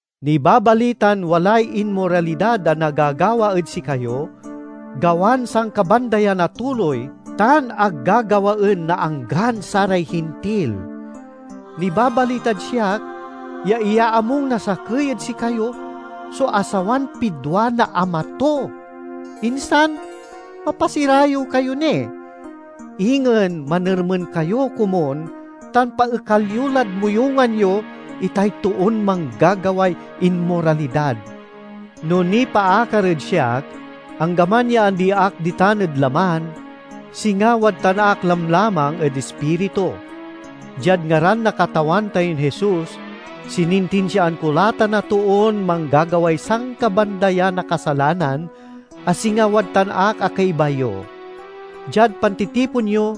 Nibabalitan walay inmoralidad a nagagawa ed sikayo, gawan sankabandayan a tuloy tan ag gagawaen na anggan saray Hintil. Nibabalitad siak ya iyaamung na sakey ed sikayo so asawan pidwa na ama to! Insan, mapasirayew kayo ni! Ingen manermen kayo komun tan paekal yo lad moyungan yo itay toon manggagaway inmoralidad. No nipaakar ed siak, anggaman ya andi ak ditan ed laman, singa wadtan ak lamlamang ed ispiritu. Diad ngaran na Katawan tayon Jesus, sinintinsiaan ko la tan a toon manggagaway sankabandayan a kasalanan, a singa wadtan ak a kaiba yo. Diad pantitipon yo,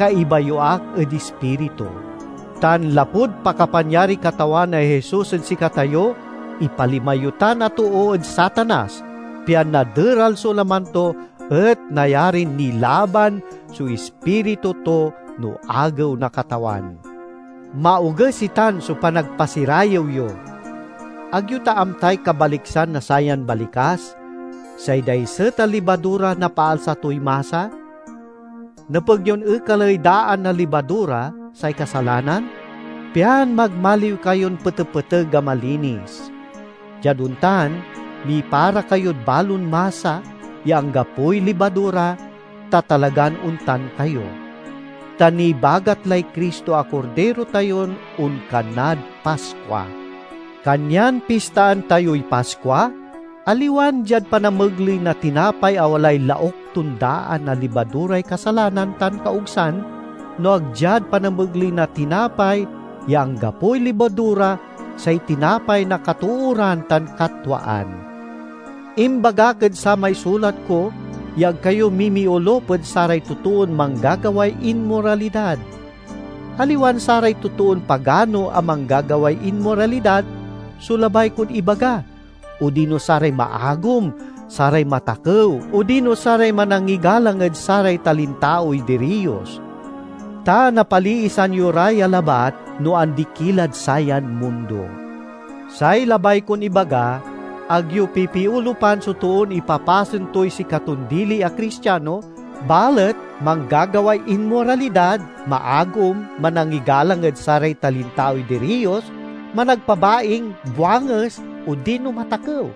kaiba yo ak ed ispiritu. Tan lapud pakapanyariy Katawan a Jesus ed sikatayo, ipalima yo tan a too ed Satanas pian naderal so laman to, et nayarin nilaban so ispiritu to no Agew na Katawan. Maoges itan so panagpasirayew yo! Ag yo ta amtay kabaliksan na sayan balikas, "Say daiset a libadura napaalsa toy masa?" Nepeg yon ekaley daan a libadura, say kasalanan, pian magmaliw kayon petepeteg a malinis. Diad ontan mipara kayod balon masa ya anggapoy libadura, ta talagan ontan kayo. Ta nibagat lay Cristo a Kordiro tayon onkanad Paskua. Kanyan pistaan tayoy Paskua, aliwan diad panamegley na tinapay a walay lauk ton daan a libaduray kasalanan tan kaogsan, no ag diad panamegley na tinapay ya anggapoy libadura, say tinapay na katooran tan katwaan. Imbagak ed samay sulat ko ya ag kayo mimiolup ed saray totoon manggagaway inmoralidad. Aliwan saray totoon pagano a manggagaway inmoralidad so labay kon ibaga, odino saray maagom, saray matakew odino saray manangigalang ed saray talintaoy diriyos. Ta napaliisan yo ra ya labat no andi ki lad sayan mundo. Say labay kon ibaga, ag yo pipiolupan so toon ipapasen toy sikaton dili a Cristiano, balet manggagaway inmoralidad, maagom, manangigalang ed saray talintaoy diriyos, managpabaing, buanges, odino matakew.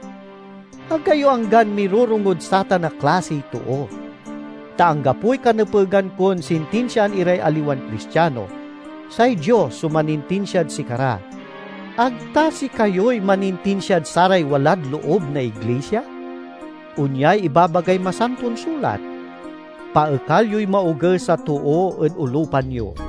Ag kayo anggan mirorongod satan a klasiy too. Ta anggapoy kanepegan kon sintinsiaan iray aliwan Cristiano. Say Dios so manintinsiad sikara. Ag ta sikayoy manintinsia ed saray walad loob na iglisia? Onyay ibabagay Masanton Sulat, "Paekal yoy maoges a too ed olupan yo."